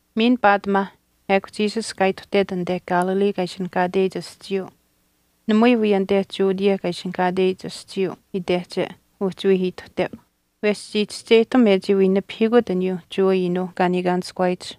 Miin paatimaa ekw Jesus kaa ituhtet anite Galilee kaa ishinihkaateyich aschiiyuu, namui wii anite Judea kaa ishinihkaateyich aschiiyuu itehche uhchi wii ituhteu wesh chii chischeyihtam e chii wii nipahiikut aniyuu Jewa iinuuh kaa niikaanishkuwaayich.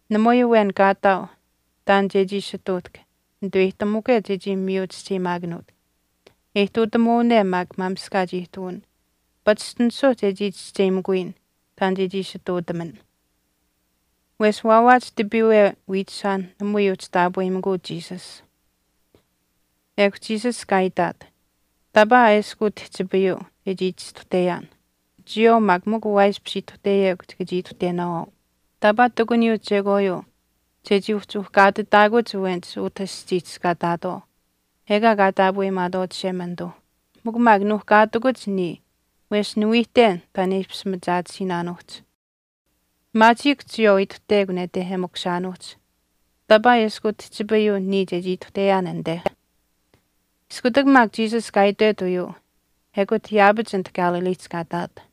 Namui awen kaataau taan chechii ishi ihtuutahk netuweyihtamukwe chechii miyu chischeyimaakanuut. E ihtuutamuwane maak maamishkaach ihtuwin, pachishtinisuu chechii chischeyimakuyin taan chechii ishi ihtuutaman.” Wesh wawaach tipiiwe wiichishaanh namui uhchi taapweyimikuu Jesus. Ekw Jesus kaa itaat, “Taapaa eshkw utihchipayuu chechii chistuhteyaan, chiyawaau maak mikw waaishpish ituhteyekw chika chii ituhtenaawaau. Taapaa ihtakuniyuu chekwaayuu chechii uhchi uhkaatitaakuch awenich utah aschiihch kaa ihtaatwaau ekaa kaa taapweyimaatwaau Chishemanituu, mikw maak nuuhkaatikuch niya wesh niwiihten taan e ishpish machaatisiinaanuuhch. Maachiikw chiyawaau ituhtekw nete e makushaanuuhch, taapaa eshkw utihchipayuu niya chechii ituhteyaan anite.” Iskutak maak Jesus kaa itwet uyuu ekut yaapach anit Galileehch kaa ihtaat.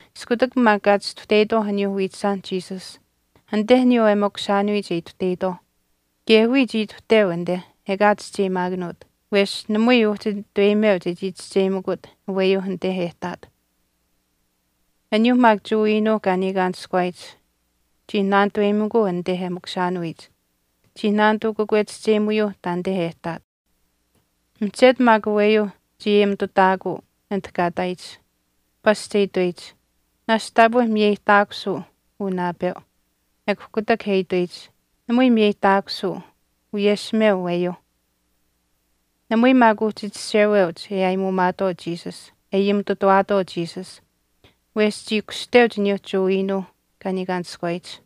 Iskutak maak kaa chistuhteyitwaau aniyuu wiichishaanh Jesus anite aniyuu e makushaanuyich e ituhteyitwaauh, kaye wiya chii ituhteu anite ekaa chischeyimakut wesh namui uhchi nitaweyimeu chechii chischeyimakut aweyuu anite e ihtaat. Aniyuuh maak Jewa iinuuh kaa niikaanishkuwaayich chii naanituweyimikuu anite e makushaanuyich. Chii naanituu kakwechischeyimuyuuh taanite e ihtaat. Mihchetu maak aweyuu chii ayimitutaakuu anit kaa ihtaayich. Pasch e itweyich, “Naashch taapwe miyeyihtaakusuu uu naapeu.” Ekw kutak e itweyich, “Namui miyeyihtaakusuu, wiyeshimeu aweyuuh.” Namui maak uhchi chisheweuch e ayimitutawaatwaau Jesus wesh chii kushteuch aniyuu Jewa iinuuh kaa niikaanishkuwaayich.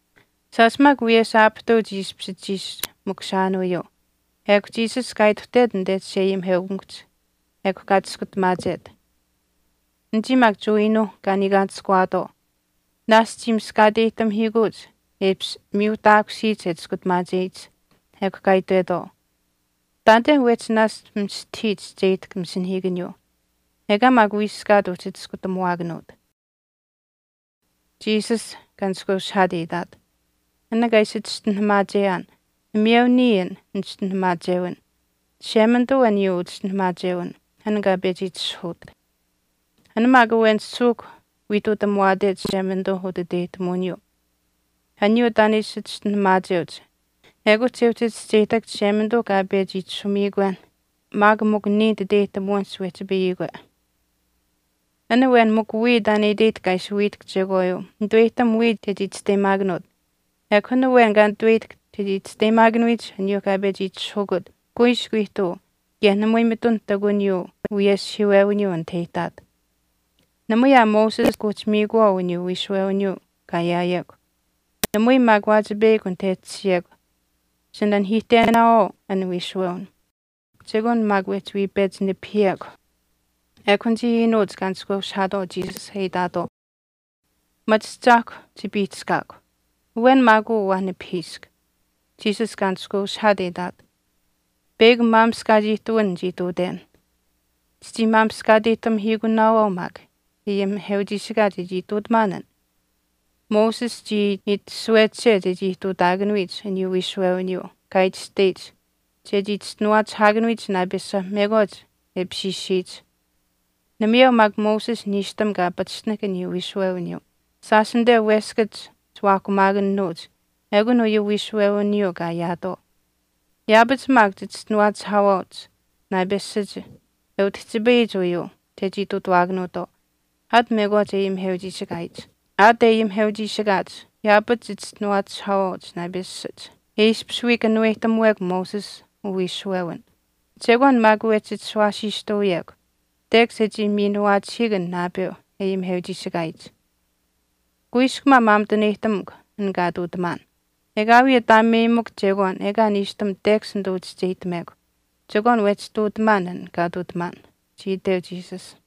Shaash maak wiyesh aapihtuu chii ishpish chiishi makushaanuyuu, ekw Jesus kaa ituhtet anite chisheayimiheukamikuhch ekw kaa Chiskutamaachet. Anichii maak Jewa iinuuh kaa niikaanishkuwaatwaau naashch chii miskaateyihtamihiikuuch e ishpish miyuuhtaakusiyich e Chiskutamaacheyich ekw kaa itwetwaau, “Taanite wehchi naashch mistahii chischeyihtahk masinahiikaniyuu ekaa maak wiiskaat uhchi chiskutamuwaakanuut.” Jesus kaa nishkweushihaat e itaat, “An kaa ishi chischinuhamaacheyaan namayeu niya an nichischinuhamaachewin, Chishemanituu aniyuu uchischinuhamaachewin, an kaa pechi itishahuut. An maak awen suuhk wii ihtuutamuwaate Chishemanituu utiteyihtamuwiniyuu, aniyuu taan e ishi chischinuhamaacheuch ekut che uhchi chischeyihtahk Chishemanituuh kaa pechi itashumiikwen aniyuu chechii ishi chiskutamaacheuch maak mikw niya nititeyihtamuwinihch wehchipayiyikwe. An awen mikw wiya taan e iteyihtahk kaa ishi wiihtahk chekwaayuu, nituweyihtam wiya chechii chisteyimaakanuut. Ekw an awen kaa nituweyihtahk chechii chisteyimaakanuyich aniyuu kaa pechi itishahukut kuiskw ihtuu kaye namui mitun ihtakuniyuu wiyeshihiiwewiniyuu anit e ihtaat. Namui aa Moses kuuhchi miikuwaau aniyuu wiishuwewiniyuu kaa ayaawekw. Namui maak waachipeyakw anit e tashiyekw chinanihiihtenaawaau an wiishuwewin. Chekwaan maak wehchi wii pechi nipihiyekw.” Ekw anichii iinuuch kaa nishkweushihaatwaau Jesus e itaatwaau, “Machahchaahkw chipiihchishkaakw. Awen maak uu waa nipahiisk.” Jesus kaa nishkweushihaat e itaat, “Peyakw maamishkaach ihtuwin nichii ihtuuten, chichii miskaateyihtamihiikunaawaau maak e ayimiheuchiishikaach e chii ihtuutamaan an. Moses chii itashuweche chechii ihtuutaakanuyich aniyuu wiishuwewiniyuu kaa itashteyich chechii chischinuwaachishwaakanuyich naapesha mekwaach e apishiishiyich. Namayeu maak Moses niishtam kaa pachishtinahk aniyuu wiishuwewiniyuu, shaash anite weskach chiwaahkumaakanuuch ekun uyuu wiishuwewiniyuu kaa ayaatwaau. Yaapach maak chichischinuwaachishwaawaauch naapeshach e utihchipayiyich uyuu chechii ihtuutuwaakanuutwaau aat mekwaach e Jewa ayimiheuchiishikaayich. Aat e Jewa ayimiheuchiishikaach yaapach chichischinuwaachishwaawaauch naapeshach e ishpish wii kanuweyihtamuwekw Moses uwiishuwewin, chekwaan maak wehchi chishuwaasiistuuyekw tekash e chii miinuwaachihiik an naapeu e ayimiheuchiishikaayich. Kuiskw maa maamituneyihtamukw an kaa ihtuutamaan. Ekaawii ataameyimikw chekwaan ekaa niishtam tekash nituu chischeyihtamekw chekwaan wehchii ihtuutamaan an kaa ihtuutamaan,” chii iteu Jesus.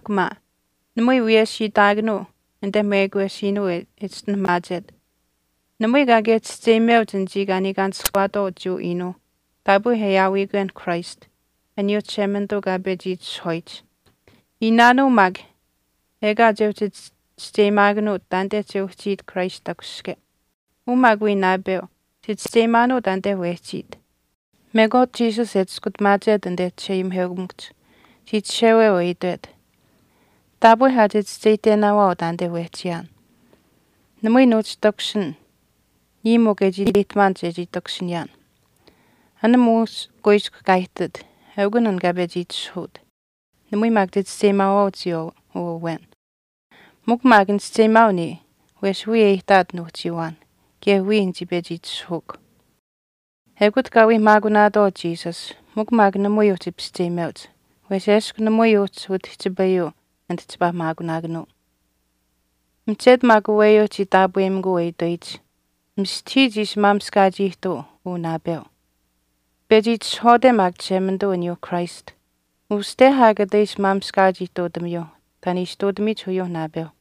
Kanawaapamaahkw maa. Namui wiyesh itaakanuu anite mekwesiinuu e chischinuhamaachet. Namui kaakaye chischeyimeuch anichii kaa niikaanishkuwaatwaau Jewa iinuuh taapwe e aawiyikwen Christ, aniyuu Chishemanituu kaa pechi itishahwaayich. Iinaanuu maak ekaa che uhchi chischeyimaakanuut taanite che uhchiit Christ takushihke. Uu maak wii naapeu chichischeyimaanuu taanite wehchiit.” Mekwaach Jesus e chiskutamaachet anite chisheayimiheukamikuhch, chii chisheweu e itwet, “Taapwe aa chichischeyiminaawaau awen niya. Taapwe aa chichischeyihtenaawaau taanite wehchiyaan. Namui nuuhchi takushin niya mikw e chii iteyihtamaan chechii takushiniyaan. An muush kuiskw kaa ihtit eukun an kaa pechi itishahuut, namui maak chichischeyimaawaau chiyawaau uu awen. Mikw maak nichischeyimaau niya wesh wiya e ihtaat nuuhchiiwaan kaye wiya nichii pechi itishahuukw.” Ekut kaa wii maakunaatwaau Jesus mikw maak namui uhchi pischeyimeuch, wesh eshkw namui uhchi utihchipayuu anit chipaa maakunaakanuu. Mihchetu maak aweyuu chii taapweyimikuu e itweyich, “Mistahii chii ishi maamishkaach ihtuu uu naapeu. Pechi itishahwaate maak Chishemanituu aniyuuh Christ, uste aa kata ishi maamishkaach ihtuutamiyuuh taan e ishi ihtuutamiyich uyuu naapeu.”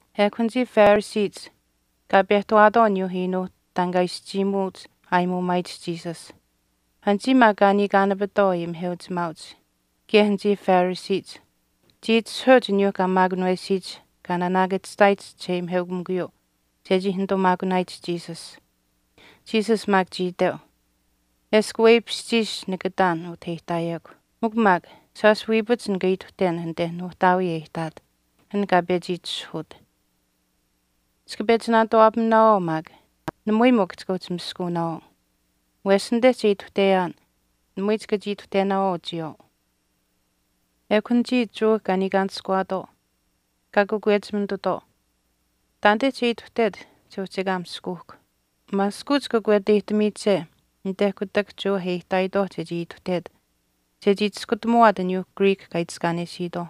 Ekw anichii Phariseech kaa pehtawaatwaau aniyuuh iinuuh taan kaa ishi chiimuut aayimuumaayich Jesus. Anichii maak kaa niikaanapitwaau ayimiheuchimaauch kaye anichii Phariseech chii itishahuweuch aniyuuh kaa maakunawesiyich kaa naanaakachihtaayich chisheayimiheukamikuyuu chechii nituu maakunaayich Jesus. Jesus maak chii iteu, “Eshkw weipishchiish nika ihtaan utah e ihtaayekw. Mikw maak shaash wiipach nika ituhten anite nuuhtaawii e ihtaat, an kaa pechi itishahuut. Chika pechi naanituwaapaminaawaau maak, namui mikw chika uhchi miskunaawaau, wesh anite che ituhteyaan namui chika chii ituhtenaawaau chiyawaau.” Ekw anichii Jewa kaa niikaanishkuwaatwaau kaa kakwechimitutwaau, “Taanite che ituhtet che uhchi ekaa miskuuhk. Maaskuuch kakweteyihtamiiche anite kutak Jewa e ihtaayitwaauh chechii ituhtet chechii chiskutamuwaat aniyuu Greek kaa itiskaanesiitwaauh.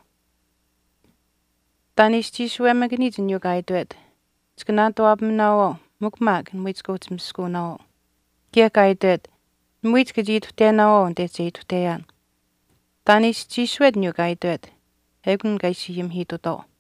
Taan e ishi chiisuwemakaniyich aniyuu kaa itwet, chika naanituwaapaminaawaau mikw maak namui chika uhchi miskaaunaawaau. Kaye kaa itwet, namui chika chii ituhtenaawaau anite che ituhteyaan. Taan e ishi chiisuwet aniyuu kaa itwet, ekun kaa ishi ayimihiitutwaau.”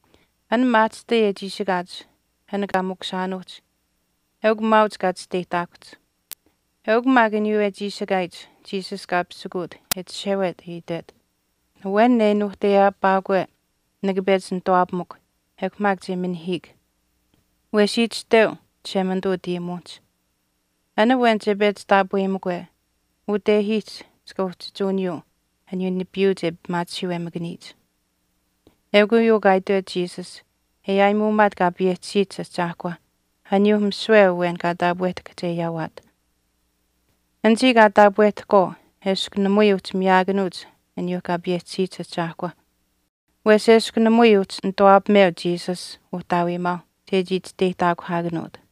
An maahchishtai e chiishikaach an kaa makushaanuuhch eukw maauch kaa chisteyihtaakuhch. Eukw maak aniyuu e chiishikaayich Jesus kaa pisikuut e chishewet e itwet, “Awen e nuuhteyaapaakwekwe nika pechi nituwaapamukw ekw maak che minihiik. Wesh itashteu Chishemanituu utayimuwinihch, ‘An awen che pechi taapweyimikwe, utehiihch chika uhchichuuniyuu aniyuu nipiiyuu kaa pimaachihiiwemakaniyich.’” Eukw uyuu kaa itwet Jesus e aayimuumaat Kaa payehchisiyich Ahchaahkwa, aniyuu misiwe awen kaa taapwehtahk che ayaawaat. Anichii kaa taapwehtahkwaau eshkw namui uhchi miyaakanuuch aniyuuh Kaa payehchisiyich Ahchaahkwa wesh eshkw namui uhchi nituwaapameu Jesus uhtaawiimaauh chechii chisteyihtaakuhaakanuut.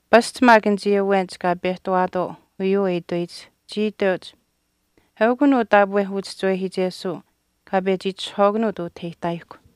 Pasch maak anichii awenich kaa pehtawaatwaau uyuu e itweyich, chii iteuch, “Eukun uu taapwe uchischiwehiichesuu kaa pechi itishahwaakanuut utah e ihtaayihkw.”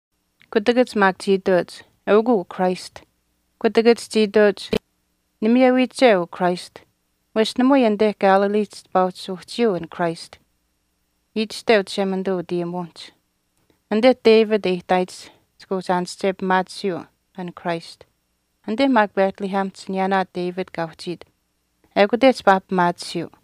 Kutakach maak chii iteuch, “Eukw uu Christ.” Kutakach chii iteuch, “Namiyewiiche uu Christ, wesh namui anite Galileehch chipaa uhchi uhchiyuu an Christ. Itashteu Chishemanituu utayimuwinihch, ‘Anite David e ihtaayich chika uhchi aanische pimaatisiyuu an Christ, anite maak Bethlehemihch aniyaanaa David kaa uhchiit ekute chipaa pimaatisiyuu.’”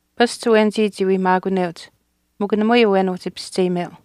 Pasch awenichii chii wii maakuneuch mikw namui awen uhchi pischeyimeu.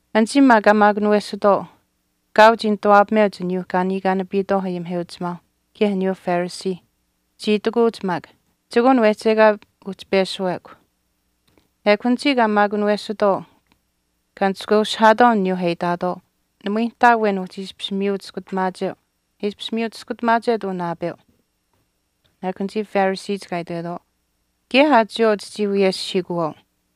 Anichii maak kaa maakunawesuutwaau kaau chii nituwaapameuch aniyuu kaa niikaanapitwaau ayimiheuchimaauh kaye aniyuuh Phariseeh. Chii itikuuch maak, “Chekwaan wehchi ekaa uhchi peshuwekw.” Ekw anichii kaa maakunawesuutwaau kaa nishkweushihaatwaau aniyuuh e itaatwaau, “Namui nihtaa awen uhchi ishpish miyu chiskutamaacheu e ishpish miyu chiskutamaachet uu naapeu.” Ekw anichii Phariseech kaa itwetwaau, “Kaye aa chiyawaau chichii wiyeshihiikuwaau.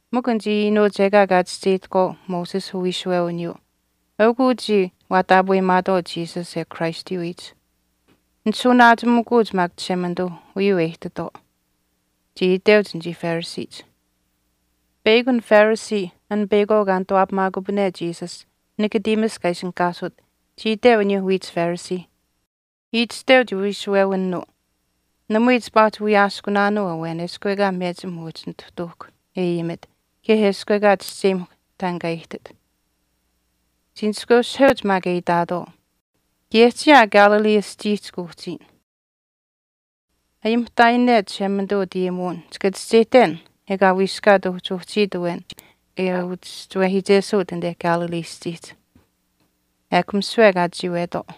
Mikw anichii iinuuch ekaa kaa chischeyihtahkwaau Moses uwiishuwewiniyuu eukw uchii waa taapweyimaatwaau Jesus e aawiyich Christ, nishuuwanaachimikuuch maak Chishemanituuh uyuu e ihtitwaau,” chii iteuch anichii Phariseech. Peyakw an Pharisee an peyakwaau kaa nituwaapamaakupane Jesus, Nicodemus kaa ishinihkaasut, chii iteu aniyuu wiich Phariseeh, itashteu chiwiishuwewinuu, “Namui chipaa uhchi wiyaaskunaanuu awen eshkw ekaa mechim uhchi nituhtuuhkw e ayimit kaye eshkw ekaa chischeyimahkw taan kaa ihtit.” Chii nishkweushiheuch maak e itaatwaau, “Kaye chiya aa Galilee aschiihch kuuhchiyin. Ayimihtaayine Chishemanituu utayimuwin chika chischeyihten ekaa wiiskaat uhchi uhchiit awen e uchischiwehiichesuut anite Galilee aschiihch.” Ekw misiwe kaa chiiwetwaau.